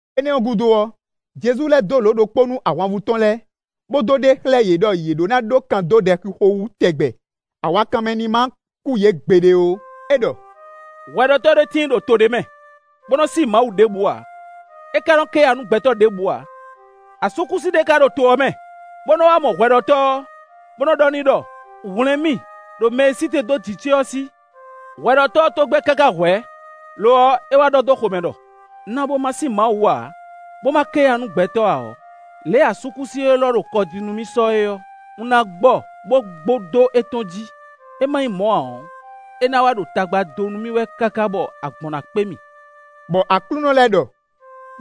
Énɛ́ ɔ́ gúdo ɔ́, Jezu lɛ́ dó lǒ ɖokpó nú ahwanvú tɔn lɛ́ɛ, bó dó ɖe xlɛ́ yě ɖɔ yě ɖó ná ɖó kan dó ɖɛxixo wú tɛgbɛ; awakanmɛ ní má kú yě gbeɖé ó; é ɖɔ: “Hwɛɖɔtɔ́ ɖé tíin ɖo to ɖé mɛ, bó nɔ sí Mawu ɖěbǔ ǎ, é ka nɔ ké ya nú gbɛtɔ́ ɖěbǔ ǎ. Asúkúsi ɖé ká ɖo to ɔ́ mɛ, bó nɔ́ wá mɔ hwɛɖɔtɔ́ ɔ́, bó nɔ́ ɖɔ n'i ɖɔ: ‘Hwlɛ̌n mì ɖo mɛ e sí te dó jǐ ce ɔ́ sí.’ Hwɛɖɔtɔ́ ɔ́ tó gbɛ́ káká hwɛ̌; lo ɔ́, é wá ɖɔ dó xomɛ ɖɔ: ‘Un na bó ma sí Mawu ǎ, bó ma ké ya nú gbɛtɔ́ ǎ ɔ́, lě e asúkúsi élɔ́ ɖo kɔ jí nú mì sɔ é ɔ́, un ná gbɔ bó gbo dó étɔn jí; é má nyí mɔ̌ ǎ ɔ́, é ná wá ɖo tagba dó nú mì wɛ káká bɔ agbɔ̌n na kpé mì.’” Bɔ Aklúnɔ lɛ́ ɖɔ: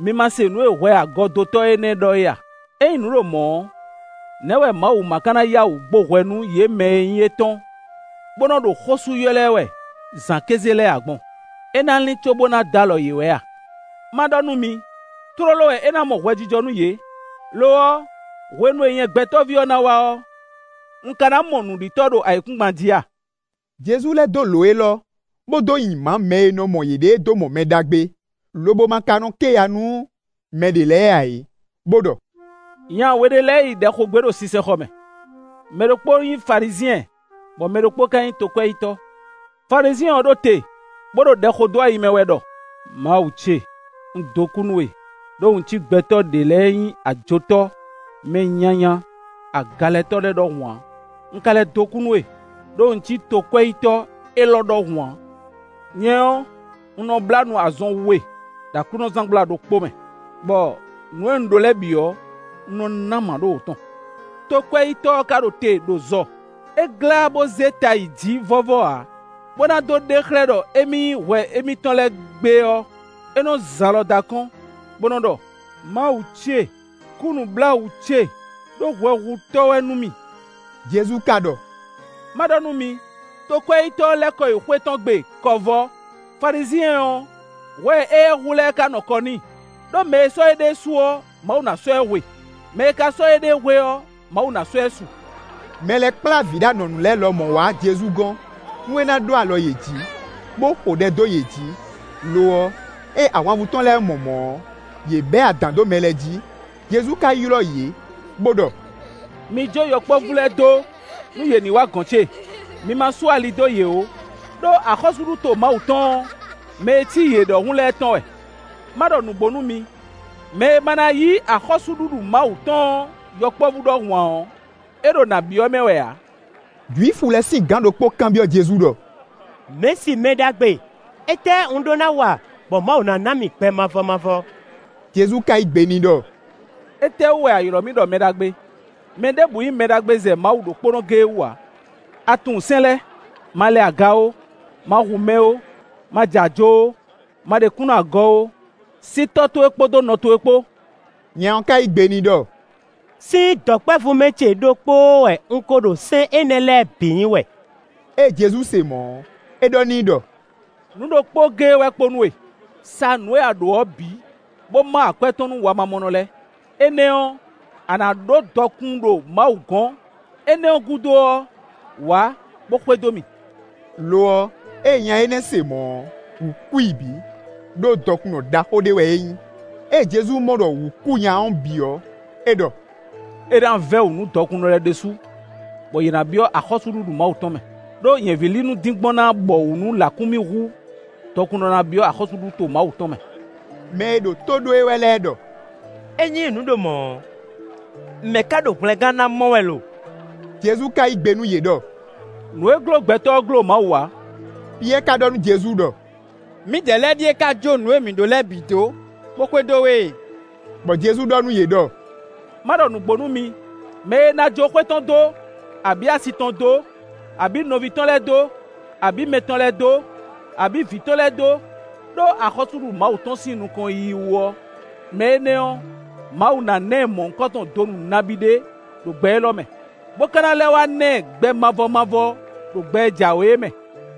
“Mi ma se nǔ e hwɛagɔdotɔ́ énɛ́ ɖɔ é a? Ényí nǔ ɖo mɔ̌ ɔ́, nɛ̌ wɛ Mawu má ká ná yá wǔ gbo hwɛ nú yě mɛ e nyí étɔn, bó nɔ́ ɖo xó sú ylɔ́ ɛ wɛ zǎn kéze lɛ́ɛ ǎ gbɔn? É ná lín cóbó ná dó alɔ yě wɛ a? Má ɖɔ nú mi: tlóló wɛ é ná mɔ hwɛjijɔ nú yě. Lo ɔ́, hwenu e nyɛ Gbɛtɔ́ví ɔ́ ná wá ɔ́, un ka ná mɔ nǔɖitɔ́ ɖo ayǐkúngban jí a?” Jezu lɛ́ dó lǒ élɔ́, bó dó nyi mǎ mɛ e nɔ mɔ yěɖée dó mɔ mɛ ɖagbe, lobo ma ka nɔ ké ya nú mɛ ɖě lɛ́ɛ ǎ é, bó ɖɔ: “Nya we ɖé lɛ́ɛ yi ɖɛ xo gbé ɖo sinsɛnxɔ mɛ; mɛ ɖokpó nyí Falizyɛn, bɔ mɛ ɖokpó ka nyí tokwɛ́yítɔ́. Falizyɛn ɔ́ ɖo te, bó ɖo ɖɛ xo dó ayi mɛ wɛ ɖɔ: ‘Mawu ce! Un dó kú nú we, ɖó un cí gbɛtɔ́ ɖě lɛ́ɛ e nyí ajotɔ́, mɛ nyanya, agalɛtɔ́ lɛ́ɛ ɖɔhun ǎ. Un ka lɛ́ dó kú nú we, ɖó un cí tokwɛ́yítɔ́ élɔ́ ɖɔhun ǎ. Nyɛ ɔ́, un nɔ blá nu azɔn we ɖo aklúnɔzángbla ɖokpó mɛ, bɔ nǔ e un ɖó lɛ́ɛ bǐ ɔ́, un nɔ ná mǎɖówǒ tɔn.’ Tokwɛ́yítɔ́ ɔ́ ka ɖo te ɖo zɔ; é glá bó zé ta yi jǐ vɔ́vɔ́ ǎ; bó ná dó ɖe xlɛ́ ɖɔ émí yí hwɛ émítɔn lɛ́ɛ gbe ɔ́, é nɔ́ zin alɔ dó akɔ́n, bó nɔ́ ɖɔ: ‘Mawu ce, kú nǔbláwǔ ce, ɖó hwɛhutɔ́ wɛ nú mì.’” Jezu ka ɖɔ: “Má ɖɔ nú mi: Tokwɛ́yítɔ́ ɔ́ lɛ́ kɔ yi xwé tɔn gbe kɔ vɔ́; Falizyɛn ɔ́, hwɛ e éyɛ́ hu lɛ́ɛ ka nɔ kɔ n'i. Đó mɛ e sɔ́ éɖée su ɔ́, Mawu ná sɔ́ ɛ hwe; mɛ e ka sɔ́ éɖée hwe ɔ́, Mawu ná sɔ́ ɛ su.” Mɛ lɛ́ɛ kplá vǐ ɖo anɔ̌nu lɛ́ɛ lɔmɔ̌ wá Jezu gɔ́n, nú é ná ɖó alɔ yě jǐ, bó xo ɖɛ dó yě jí; lo ɔ́, ée ahwanvú tɔn lɛ́ɛ mɔ mɔ̌ ɔ́, yě bɛ́ adǎn dó mɛ lɛ́ɛ jí, Jezu ka ylɔ́ yě, bó ɖɔ: “Mi jó yɔkpɔ́vú lɛ́ɛ dó nú yě ní wǎ gɔ̌n ce; mi ma sú ali dó yě ó; ɖó axɔ́súɖuto Mawu tɔn ɔ́, mɛ e cí yě ɖɔhun lɛ́ɛ tɔn wɛ. Má ɖɔ nǔgbó nú mi: mɛ e ma ná yí axɔ́súɖuɖu Mawu tɔn ɔ́ yɔkpɔ́vú ɖɔhun ǎ ɔ́, é ɖo nǎ byɔ́ mɛ wɛ ǎ.” Jwifu lɛ́ɛ sín gǎn ɖokpó kanbyɔ́ Jezu ɖɔ: “Mɛ̌si; mɛ ɖagbe! Étɛ́ un ɖó ná wa bɔ Mawu na ná mì gbɛ mavɔ mavɔ?” Jezu ka yí gbe n'i ɖɔ: “Étɛ́wú wɛ a ylɔ́ mì ɖɔ mɛ ɖagbe? Mɛ ɖěbǔ nyí mɛ ɖagbe zɛ Mawu ɖokpónɔ géé wú ǎ. A tunwun sɛ́n lɛ́ɛ: ‘Ma lɛ aga ó, ma hu mɛ ó, ma ja ajo ó, ma ɖe kúnnu agɔ ó, sí tɔ́ towe kpódó nɔ towe kpó.’” Nya ɔ́ ka yí gbe n'i ɖɔ: “Sín dɔ̌nkpɛvú mɛ ce ɖokpóó wɛ un ko ɖo sɛ́n énɛ́ lɛ́ɛ bǐ nyi wɛ.” Ée Jezu se mɔ̌ ɔ́, é ɖɔ n'i ɖɔ: “Nǔ ɖokpó géé wɛ kpo nú we: sa nǔ e a ɖǒ ɔ́ bǐ, bó má akwɛ́ tɔn nú wamamɔnɔ lɛ́ɛ; énɛ́ ɔ́, a nǎ ɖó dɔkun ɖo Mawu gɔ̌n; énɛ́ ɔ́ gúdo ɔ́, wǎ, bó xwedó mì.” Lo ɔ́, ée nya énɛ́ se mɔ̌ ɔ́, wǔ kú i bǐ, ɖó dɔkunnɔ ɖaxó ɖé wɛ é nyí. Ée Jezu mɔ ɖɔ wǔ kú nya ɔ́ bǐ ɔ́, é ɖɔ: “É ná vɛ́ wǔ nú dɔkunnɔ lɛ́ɛ ɖésú, bɔ yě ná byɔ́ axɔ́súɖuɖu Mawu tɔn mɛ. Đó, nyɛ̌vílinu dín gbɔn ná bɔwǔ nú lǎkúnmí hú dɔkunnɔ ná byɔ́ axɔ́súɖuto Mawu tɔn mɛ.” Mɛ e ɖo tó ɖó e wɛ lɛ́ɛ ɖɔ: “Ényí nǔ ɖo mɔ̌ ɔ́, mɛ̌ ka ɖo hwlɛngán ná mɔ wɛ lo?” Jezu ka yí gbe nú yě ɖɔ: “Nǔ e gló gbɛtɔ́ ɔ́ gló Mawu ǎ.” Piyɛ́ɛ ka ɖɔ nú Jezu ɖɔ: “Mǐdɛɛ lɛ́ɛ ɖíe ka jó nǔ e mǐ ɖó lɛ́ɛ bǐ dó, bó xwedó we e.” Bɔ Jezu ɖɔ nú yě ɖɔ: “Má ɖɔ nǔgbó nú mi; mɛ e ná jó xwé tɔn dó, abǐ asi tɔn dó, abǐ nɔví tɔn lɛ́ɛ dó, abǐ mɛ tɔn lɛ́ɛ dó, abǐ vǐ tɔn lɛ́ɛ dó, ɖó axɔ́súɖuɖu Mawu tɔn sín nukɔn yiyi wú ɔ́, mɛ énɛ́ ɔ́, Mawu ná ná ɛ mɔ̌hunkɔtɔn donu nabí ɖé ɖo gbɛ élɔ́ mɛ, bó ka ná lɛ́ wá na ɛ gbɛ mavɔ mavɔ ɖo gbɛ e jǎwe é mɛ.”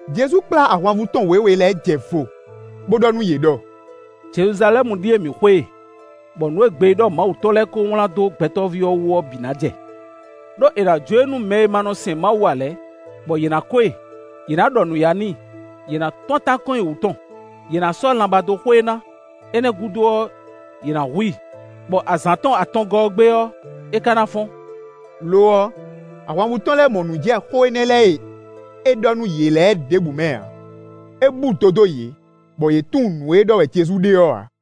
Jezu kplá ahwanvú tɔn wěwe lɛ́ɛ jɛ vo, bó ɖɔ nú yě ɖɔ: “Jeluzalɛ́mu ɖíe mǐ xwe e, bɔ nǔ e gbeyíɖɔ Mawu tɔn lɛ́ɛ kó wlán dó Gbɛtɔ́ví ɔ́ wú ɔ́ bǐ ná jɛ. Đó è nǎ jó e nú mɛ e ma nɔ sɛn Mawu ǎ lɛ́ɛ, bɔ yě ná ko e; yě ná ɖɔ nǔyá n'i; yě ná tún atán kɔn nyi wú tɔn, Yě ná sɔ́ lanbá dó xo e ná. Énɛ́ ɔ́ gúdo ɔ́, yě ná hu i, bɔ azǎn tɔn atɔngɔ́ ɔ́ gbe ɔ́, é ka ná fɔ́n.” Lo ɔ́, ahwanvú tɔn lɛ́ɛ mɔ nǔ jɛ xó énɛ́ lɛ́ɛ e é ɖɔ nú yě lɛ́ɛ ɖěbǔ mɛ ǎ, é búdo dó yě, bɔ yě tunwun nǔ e ɖɔ wɛ Jezu ɖe ɔ́ ǎ.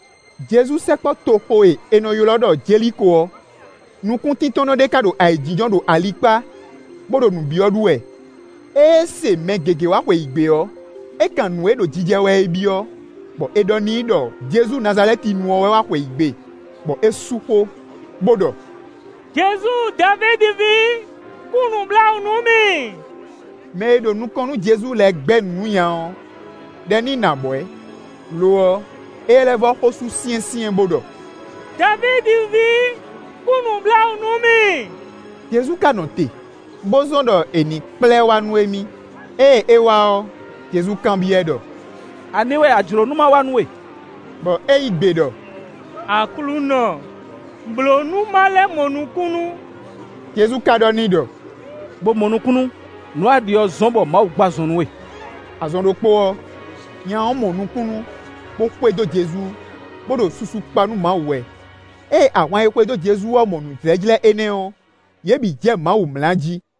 Jezu sɛkpɔ́ toxo e è nɔ ylɔ́ ɖɔ Jeliko ɔ́, nukúntíntɔ́nnɔ ɖé ka ɖo ayǐjínjɔ́n ɖo ali kpá, bó ɖo nǔ byɔ́ ɖu wɛ. Ée é se mɛ gěgé wá xweyǐgbe ɔ́, é kan nǔ e ɖo jijɛ wɛ é byɔ́, bɔ è ɖɔ n'i ɖɔ Jezu Nazalɛ́tinu ɔ́ wɛ wá xweyǐgbe. Bɔ é sú xó, bó ɖɔ: “Jezu Davídi ví, kú nǔbláwǔ nú mì!” Mɛ e ɖo nukɔn nú Jezu lɛ́ɛ gbɛ́ nǔ nú nya ɔ́ ɖɔ ní nɔ abwɛ̌; lo ɔ́, éyɛ́ lɛ́ vɔ́ xó sú syɛ́nsyɛ́n, bó ɖɔ: “Davídi ví, kú nǔbláwǔ nú mì!” Jezu ka nɔ te, bó zɔ́n ɖɔ è nǐ kplá ɛ wá nú émí. Ée é wá ɔ́, Jezu kanbyɔ́ ɛ ɖɔ: “Ani wɛ a jlǒ nú ma wa nú we?” Bɔ é yí gbe ɖɔ: “Aklúnɔ, blǒ bónú ma lɛ́ mɔ nukúnnú.” Jezu ka ɖɔ n'i ɖɔ: “Bo mɔ nukúnnú! Nǔ e a ɖi ɔ́ zɔ́n bɔ Mawu gbɔ azɔn nú we.” Azɔn ɖokpó ɔ́, nya ɔ́ mɔ nukúnnú, bó xwedó Jezu, bó ɖo susu kpa nú Mawu wɛ. Ée ahwan e xwedó Jezu ɔ́ mɔ nǔjlɛ́jlɛ́ énɛ́ ɔ́, yě bǐ jɛ Mawu mlá jí.